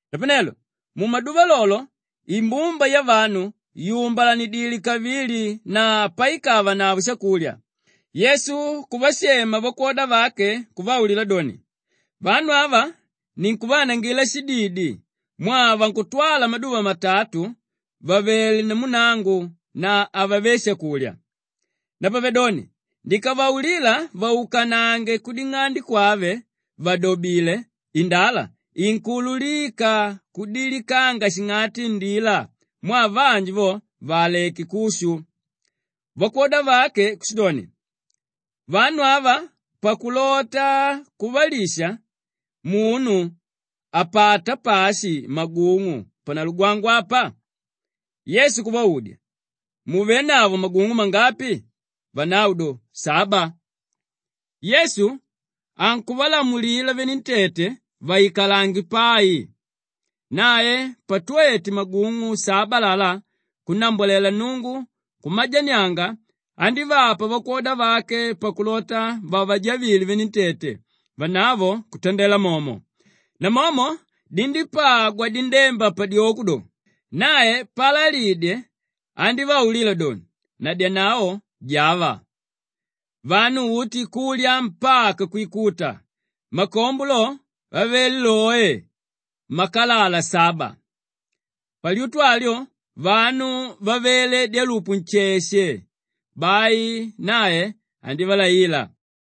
Napanelo mumaduva lolo lo, imbumba yavanu yùmbalanidile kavili na paikavanavo shakulya, Yesu kuvashema vakwoda vake kuvaulila doni, “Vanu ava ninkuvaanangila shididi mwaa vankutwala maduva matatu vavelé namu nangu na havave shakulya. Napavedoni ndikavaulila vaukanange kuding'ande kwave vàdobile indala, inkuululika kudilikanga shing'ati indila mwaa vanji vo vaaleke kushu.” Vakwoda vake kushidoni, “Vanu ava pakulota kuvalisha munu apata pashi magung'u panalugwangwa apa?” Yesu kuvaudya, “Muvénavo magung'u mangapi?” Vanavo do, “Saba.” Yesu ankuvalamulila venentete vaikalange pai. Nae patwete magung'u saba alalá kunnambwalela Nnungu kumajanianga, andívapa vakwoda vake pakulota vavajavile venentete, vanavo kutandela momo. Namomo dindípagwa dindemba padyoko do, nae paalalidye andívaulila doni, “Nadyanavo, java.” Vanu uti kulya mpaka kwikuta. Makombo lo avele oe, makalala saba. Palyutu alyo vanu vavele dyalupu nsheshe, bai nae andívalaila.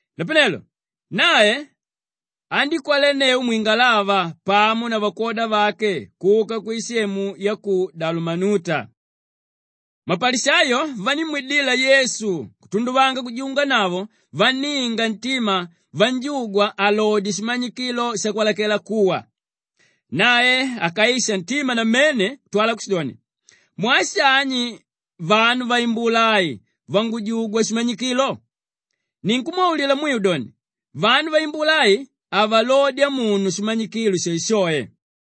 Napanelo nae andíkwelenneu mwingalava pamo na vakwoda vake kuka kwisemu ya ku Dalamanuta. Mapalishayo vandímwidila Yesu kutunduvanga kujunganavo vanninga ntima vanjugwa alodye shimanyikilo shakwalakela kuwa. Nae akaisha ntima namene kutwala kushidoni, “Mwaa shani vanu vaimbula ai vangujugwa shimanyikilo? Ninkumwaulila mwiu doni, vanu vaimbula ai havalodya munu shimanyikilo shoeshoe.”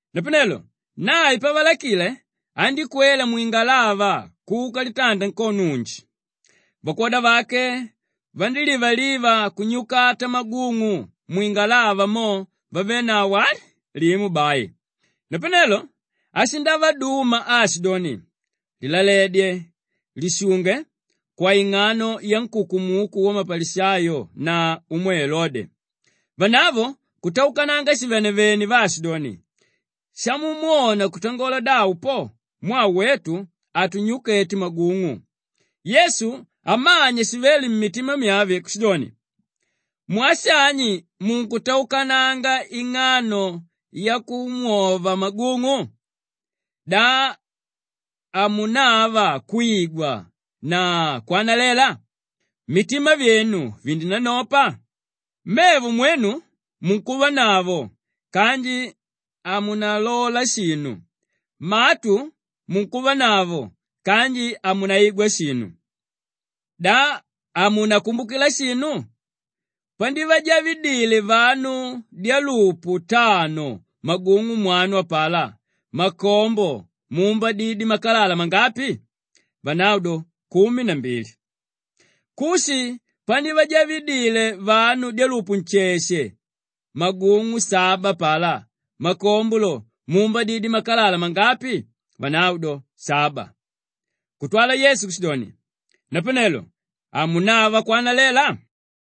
Napanelo nae pavalakile, andíkwela mwingalava kuka litanda nkono unji. Vakwoda vake vandílivaliva kunyukata magung'u, mwingalava mo vavénavo ali, limo bai. Napanelo ashindavaduma aashidoni, “Lilaledye! Lishunge kwaing'ano yankukumuku wamapalishayo na umwe Elode!” Vanavo kutaukananga shivenevene vaashidoni, “Shamumwona kutangola davo po, mwaa wetu hatunyukete magung'u.” Yesu amanya shivéle mmitima myave kushidoni, “Mwaa shani munkutaukananga ing'ano yakumwova magung'u? Da hamunava kwigwa na kwanalela? Mitima vyenu vindinanopa? Mevo mwenu munkuvanavo kanji hamunalola shinu; matu munkuvanavo kanji hamunaigwa shinu. Da hamunakumbukila shinu? Pandivajavidile vanu dyelupu tano magung'u mwanu apalá, makombo muumbadidye makalala mangapi?” Vanavo do, “Kumi na mbili.” “Kushi pandivajavidile vanu dyalupu nsheshe magung'u saba apalá, makombo lo muumbadidye makalala mangapi?” Vanavo do, “Saba.” Kutwala Yesu kushidoni, “Napanelo hamunava kwanalela?”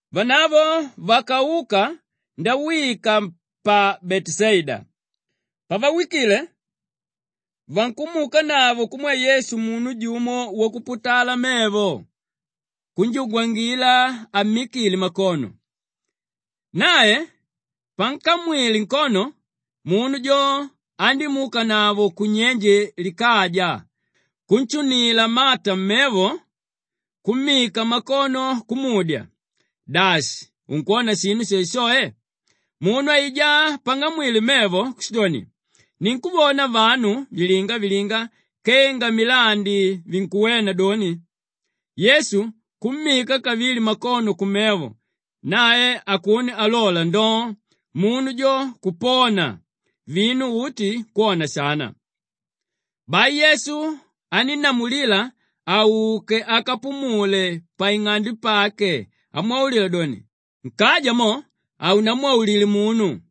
Vanavo vakauka ndawika pa Beteshaida. Pavawikile, vankumwidanavo kumwe Yesu munu jumo wakuputala mevo kunjugwangila ammikile makono. Nae pankamwile nkono munu jo andímuukanavo kunyenje likaja, kunshunila mata mmevo, kummika makono kumudya, “Dashi unkwona shinu shoeshoe?” Munu aijá pang'amwile mevo kushidoni, “Ninkuvona vanu vilinga-vilinga kenga milandi vinkuwena doni.” Yesu kummika kavili makono kumevo nae akuno alola ndoo! Munu jo kupona vinu uti kwona shana. Bai Yesu anínnamulila auke akapumule pang'ande pake amwaulila doni, “Nkaja mo, haunamwaulile munu.”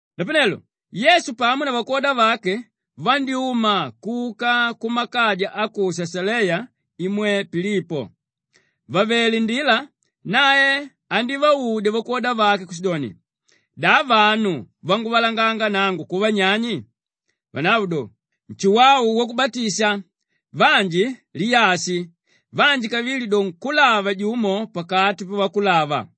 Napanelo Yesu pamo na vakwoda vake vandyúma kuka kumakaja a ku Shashaleya imwe Pilipo. Vàvele ndila nae andívaudya vakwoda vake kushidoni, “Da vanu vanguvalanganga nangu kuva nyani?” Vanavo do, “Nshuwau Wakubatisha, vanji Liyashi, vanji kavili do nkúlava jumo pakati pavakulava.”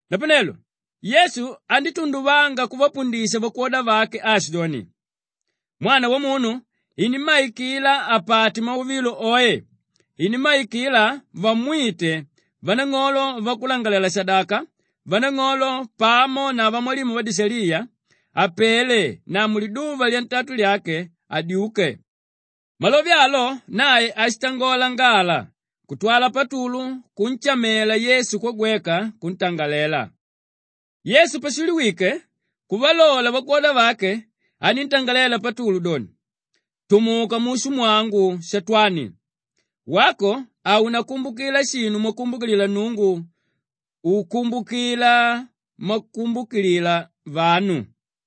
Napanelo Yesu andítunduvanga kuvapundisha vakwoda vake aashidoni, “Mwana Wamunu inimmaikila apate mauvilo oe; inimmaikila vamwite vanang'olo, vakulangalalela-shadaka vanang'olo pamo na vamwalimu vadishaliya, apele na muliduva lyantatu lyake adyuke.” Malove alo nae ashitangola ngala kutwala Patulu kunshamela Yesu kwagweka kuntangalela. Yesu pashiliwike kuvalola vakwoda vake, aníntangalela Patulu doni, “Tumuka mushu mwangu Shatwani! Wako haunakumbukila shinu mwakumbukilila Nnungu, ukumbukila mwavakumbukilila vanu.”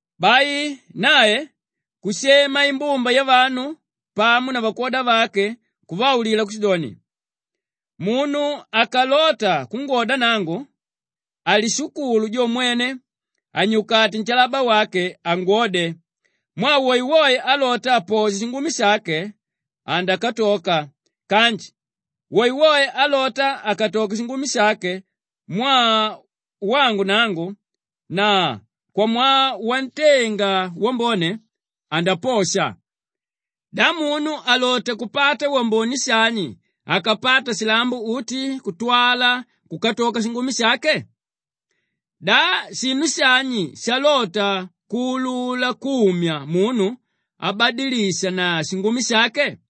Bai nae kushema imbumba yavanu pamo na vakwoda vake kuvaulila kushidoni, “Munu akalota kungwoda nangu, alishukulu jo mwene anyukate nshalaba wake angwode. Mwaa woewoe álota aposhe shingumi shake, andakatoka kanji woewoe álota akatoke shingumi shake mwaa wangu nangu na kwamwaa wantenga wambone, andaposha. Da munu alota kupata wambone shani akapata shilambo uti kutwala kukatoka shingumi shake? Da shinu shani shalota kuulula kumya munu abadilishe na shingumi shake?